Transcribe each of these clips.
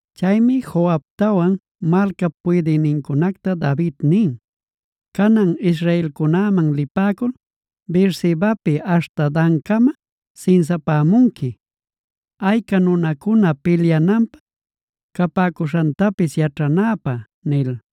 Chaymi Joabtawan malcap puydïnincunacta David nin: “Canan israelcunäman lipäcul Beersebapi aśhta Dancama sinsapämunqui, ayca nunacuna pilyananpä capäcuśhantapis yaćhanäpä” nil.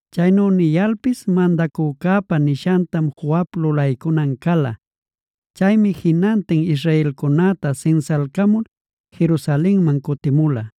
Chaynu niyalpis mandacücäpa nishantam Joab lulaycunan cala. Chaymi jinantin israelcunäta sinsalcamul Jerusalenman cutimula.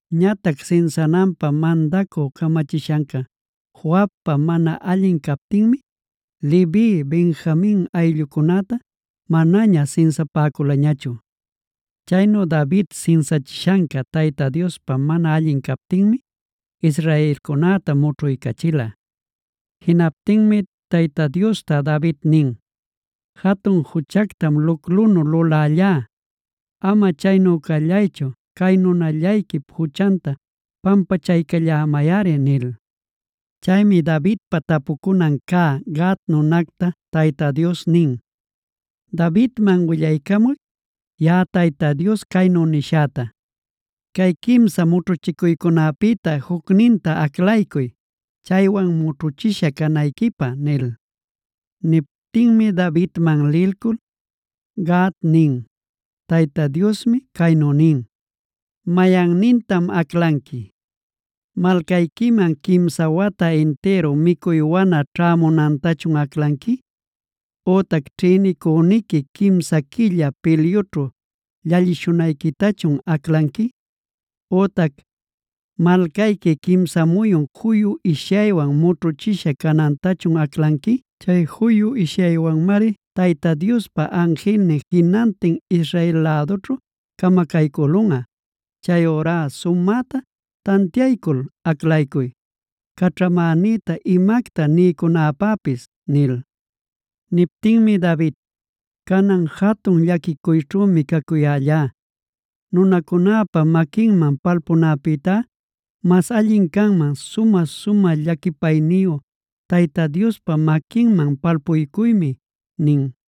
Ñatac sinsananpä mandacü camachishanca Joabpa mana allin captinmi, Levi, Benjamin ayllucunätá manaña sinsapäculañachu. Chaynu David sinsachishanca Tayta Diospa mana allin captinmi, israelcunäta mućhuycachila. Jinaptinmi Tayta Diosta David nin: “Jatun juchactam luclunu lulällá. Ama chaynu callaychu, cay nunallayquip juchanta pampachaycallämayꞌari” nil. Chaymi Davidpa tapucunan cä Gad nunacta Tayta Dios nin: “Davidman willaycamuy, yaꞌa Tayta Dios caynu nishäta: ‘Cay quimsa mućhuchicuycäpïta jucninta aclaycuy, chaywan mućhuchisha canayquipä’” nil. Niptinmi Davidman lilcul Gad nin: “Tayta Diosmi caynu nin: ‘¿Mayannintam aclanqui? ¿Malcayquiman quimsa wata intïru micuy wana ćhämunantachun aclanqui? Ütac ¿ćhïnicüniqui quimsa quilla pilyućhu llallishunayquitachun aclanqui? Ütac ¿malcayqui quimsa muyun juyu ishyaywan mućhuchishä canantachun aclanqui? Chay juyu ishyaywanmari Tayta Diospa anjilnin jinantin Israel lädućhu camacaycülunꞌa. Chayurá sumäta tantiaycul aclaycuy, caćhamänïta imacta niycunapäpis’” nil. Niptinmi David: “Canan jatun llaquićhümi cacuyällá. Nunacunäpa maquinman palpunäpïtá mas allin canman sumä-sumä llaquipayniyu Tayta Diospa maquinman palpuycuymi” nin.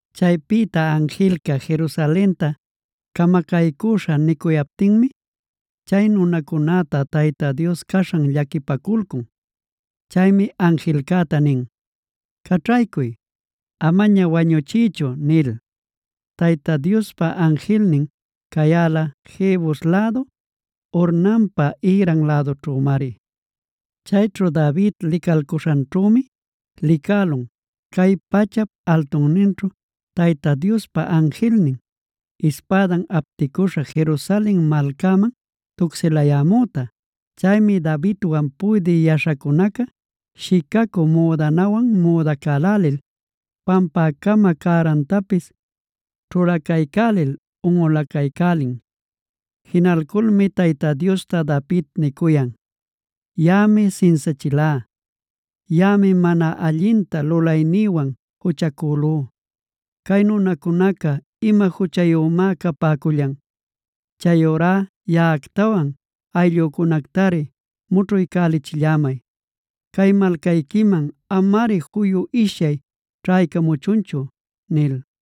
Chaypïta anjilca Jerusalenta camacaycüśha nicuyaptinmi, chay nunacunäta Tayta Dios caśhan llaquipaculcun. Chaymi anjilcäta nin: “¡Caćhaycuy! Amaña wañuchiychu” nil. Tayta Diospa anjilnin cayäla, Jebus lädu Ornanpa ïran lädunćhümari. Chayćhu David licalcuśhanćhümi licälun, cay pachap altunninćhu Tayta Diospa anjilnin, ispädan apticüśha Jerusalen malcaman tucsilayämüta. Chaymi Davidwan puydï yaśhacunaca shicacü müdanawan müdacälälil, pampäcama cärantapis ćhulacaycälil unꞌulacaycälin. Jinacuyculmi Tayta Diosta David nicuyan: “Yaꞌami sinsachilá. Yaꞌami mana allinta lulaynïwan juchacülú. ¿Cay nunacunaca ima juchayümá capäcullan? Chayurá yaꞌactawan ayllücunactari mućhuycälichillämay. Cay malcayquiman amari juyu ishyay ćhaycamuchunchu” nil.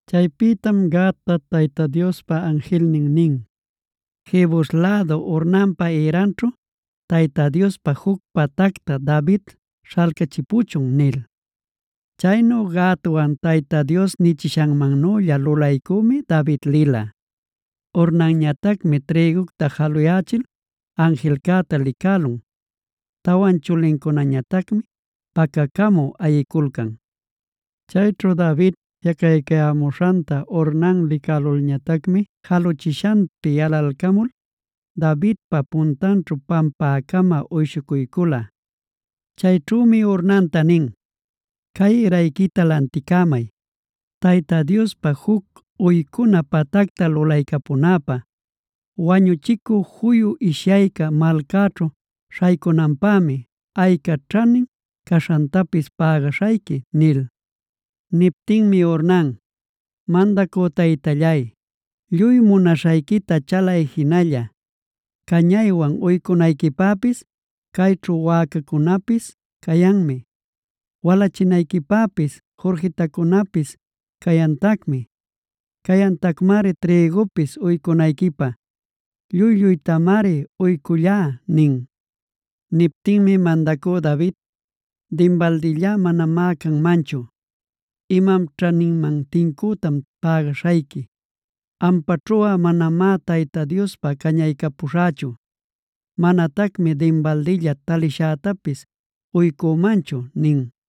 Chaypïtam Gadta Tayta Diospa anjilnin nin: “Jebus lädu Ornanpa ïranćhu, Tayta Diospä juc patacta David śhalcachipuchun” nil. Chaynu Gadwan Tayta Dios nichishanmannülla lulaycümi David lila. Ornanñatacmi trïgunta jaluyächil anjilcäta licälun. Tawan chulincunañatacmi pacacamü ayiculcan. Chayćhu David jiꞌacaycayämuśhanta Ornan licälulñatacmi jaluchishanpi yalalcamul, Davidpa puntanćhu pampäcama uyshucuycula. Chayćhümi Ornanta nin: “Cay ïrayquita lanticämay, Tayta Diospa juc uycuna patacta lulaycapunäpä. Wañuchicü juyu ishyayca malcäćhu śhaycunanpämi, ayca ćhanin caśhantapis pägaśhayqui” nil. Niptinmi Ornan: “Mandacü taytallay, lluy munaśhayquita chalay jinalla. Cañaywan uycunayquipäpis, cayćhu wäcacunapis cayanmi; walachinayquipäpis jurquitacunapis cayantacmi. Cayantacmari trïgupis uycunayquipä. Lluy-lluytamari uycullá” nin. Niptinmi mandacü David: “Dinbaldilla manamá canmanchu. Imam ćhaninman tincütam pägaśhayqui. Ampaćhuꞌa manamá Tayta Diospä cañaycapuśhächu. Manatacmi dinbaldilla talishätapis uycümanchu” nin.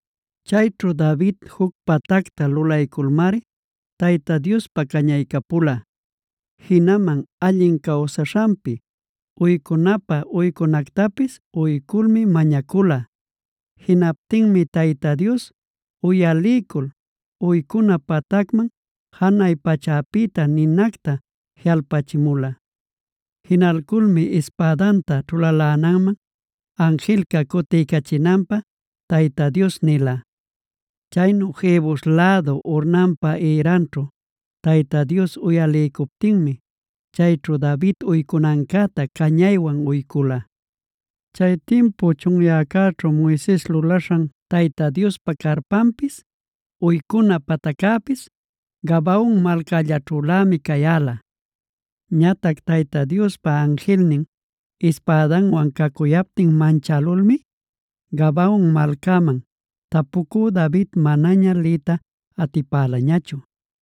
Chayćhu David juc patacta lulayculmari Tayta Diospä cañaycapula, jinaman allin cawsaśhanpi uycunapä uycunactapis uyculmi mañacula. Jinaptinmi Tayta Dios uyaliycul uycuna patacman janay pachäpïta ninacta jiꞌalpachimula. Jinalculmi ispädanta ćhulalänanman anjilca cutiycachinanpä Tayta Dios nila. Chaynu Jebus lädu Ornanpa ïranćhu Tayta Dios uyaliycuptinmi, chayćhu David uycunancäta cañaywan uycula. Chay timpu chunyäcäćhu Moises lulaśhan Tayta Diospa carpanpis, uycuna pataccäpis Gabaon malcällaćhülämi cayäla. Ñatac Tayta Diospa anjilnin ispädanwan cacuyaptin manchälulmi, Gabaon malcaman tapucü David manaña liyta atipälañachu.